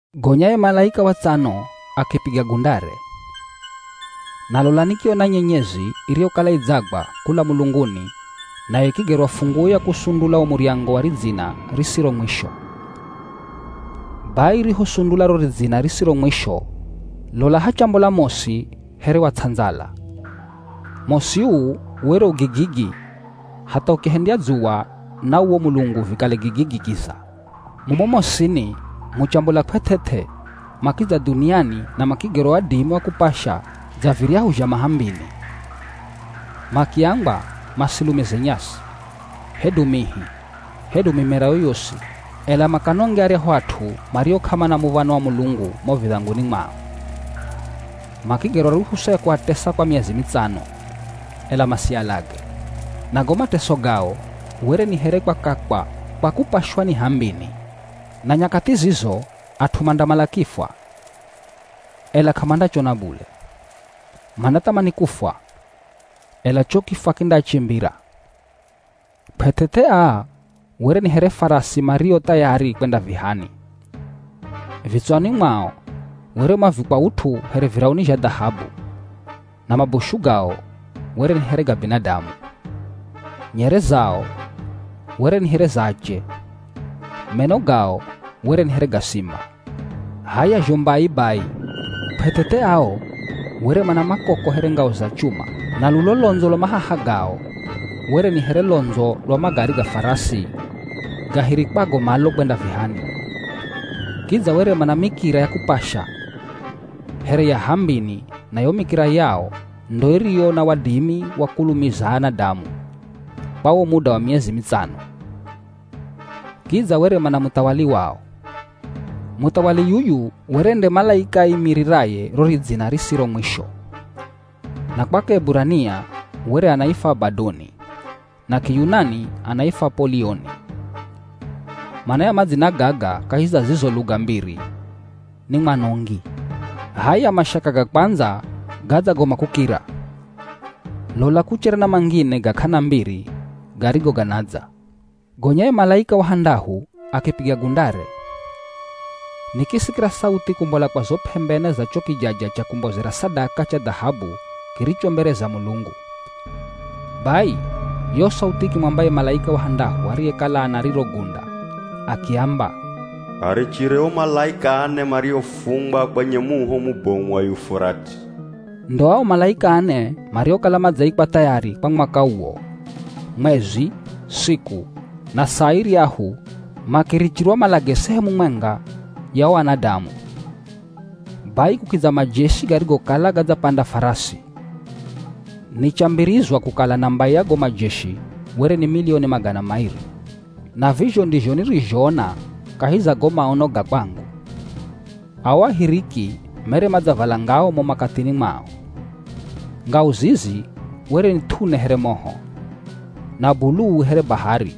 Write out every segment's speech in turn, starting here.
Gonya ye malaika wa tsano akipiga gundare. Na lola, nikiona nyenyezi iriyokala idzagwa kula mulunguni nayo ikigerwa funguo ya kusundula wo muryango wa ridzina risiro mwisho. Bai, irihosundula ro ridzina risiro mwisho lola hachambola mosi here wa ts'andzala. Mosi uu were u gigigi hatha ukihendya dzuwa na uwo mulungu vikale gigigi kiza. Mumo mosini muchambola kw'eth'eth'e makidza dhuniani na makigerwa wadimi wa kupasha dza viryahu zha mah'ambini. Makiambwa masilumize nyasi, hedu mihi, hedu mimera yoyosi, ela makanonge aryahu at'u mario k'amana muv̱ano wa Mulungu mo vidhanguni mwao. Makigerwa ruhusa ya kuatesa kwa miezi mitsano, ela masialage. Na go mateso gao were ni here kwakakwa kwa kupashwa ni h'ambini. Na nyakathi zizo at'u mandamala kifwa, ela k'amandachona bule. Mandathamani kufwa, ela cho kifwa kindaachimbira. Kw'eth'eth'e aa were ni here farasi mario thayari kwenda vihani. Vitswani mwao were mavikwa ut'u here virauni zha dhahabu na mabushu gao were ni here ga binadamu. Nyere zao were ni here za ache. Meno gao were ni here ga simba. H'aya zho mbai bai, kw'eth'eth'e ao were mana makoko here ngao za chuma. Na lulo londzo lwa mahaha gao were ni here londzo lwa magari ga farasi gahirikwago malo kwenda vihani. Kidza were mana mikira ya kupasha here ya h'ambini na yo mikira yao ndo iriyo na wadimi wa kulumiza anadamu kwa wo muda wa miezi mitsano. Kidza were mana muthawali wao. Muthawali yuyu were nde malaika aimiriraye ro ridzina risiro mwisho. Na kwa Kieburania were anaifwa Abadoni na Kiyunani anaifwa Apolioni. Mana ya madzina gaga kahi za zizo luga mbiri ni “Mwanongi.” H'aya mashaka ga kwandza gadzagoma kukira, lola kuchere na mangine ga k'ana mbiri garigo ganadza. Gonya ye malaika wa handahu akipiga gundare. Nikisikira sauthi kumbola kwa zo p'embe ne za cho kijaja cha kumbozera sadaka cha dhahabu kiricho mbere za Mulungu. Bai, yo sauthi ikimwamba ye malaika wa handahu ariyekala ana riro gunda akiamba, “Arichire o malaika ane mariofungwa kwenye muho mubomu wa Yufurati.” Ndo ao malaika ane mariokala madzaikwa thayari kwa mwaka uwo, mwezi, siku, na saa iryahu makirichirwa malage sehemu mwenga ya o anadamu. Bai kukidza majeshi garigokala gadzapanda farasi. Nichambirizwa kukala namba ya go majeshi were ni milioni magana mairi. Na vizho ndizho nirizhoona kahi za go maono ga kwangu. Ao ahiriki mere madzavala ngao mo makathini mwao. Ngao zizi were ni th'une here moho, na buluu here bahari,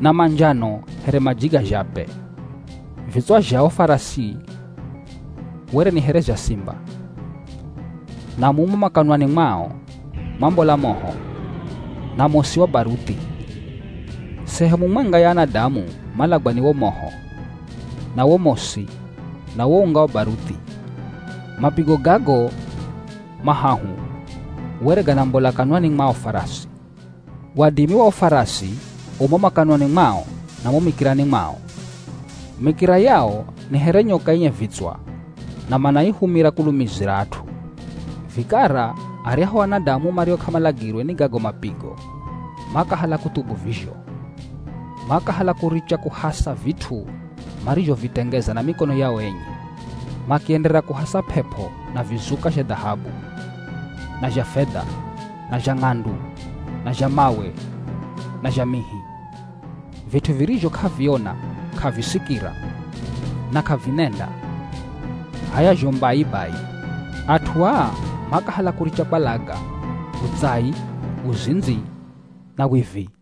na manjano here maji ga zhape. Vitswa zha o farasi were ni here zha simba. Na mumo makanwani mwao mwambola moho, na mosi wa baruthi. Sehemu mwenga ya anadamu malagwa ni wo moho, na wo mosi, na wo unga wa baruthi. Mapigo gago mahahu were ganambola kanwani mwa o farasi. Wadimi wa o farasi u mo makanwani mwao na mo mikirani mwao. Mikira yao ni here nyoka enye vitswa na manaihumira kulumizira at'u. Vikara aryahu anadamu mario k'amalagirwe ni gago mapigo, makahala kuthubu vizho. Makahala kuricha kuhasa vit'u marizhovitengeza na mikono yao enye. Makienderera kuhasa p'ep'o na vizuka zha dhahabu, na zha fedha, na zha ng'andu, na zha mawe na zha mihi. Vit'u virizho k'aviona, k'avisikira, na k'avinenda. H'aya zho mbai bai, at'u aa makahala kuricha kwalaga, utsai, uzindzi na wivi.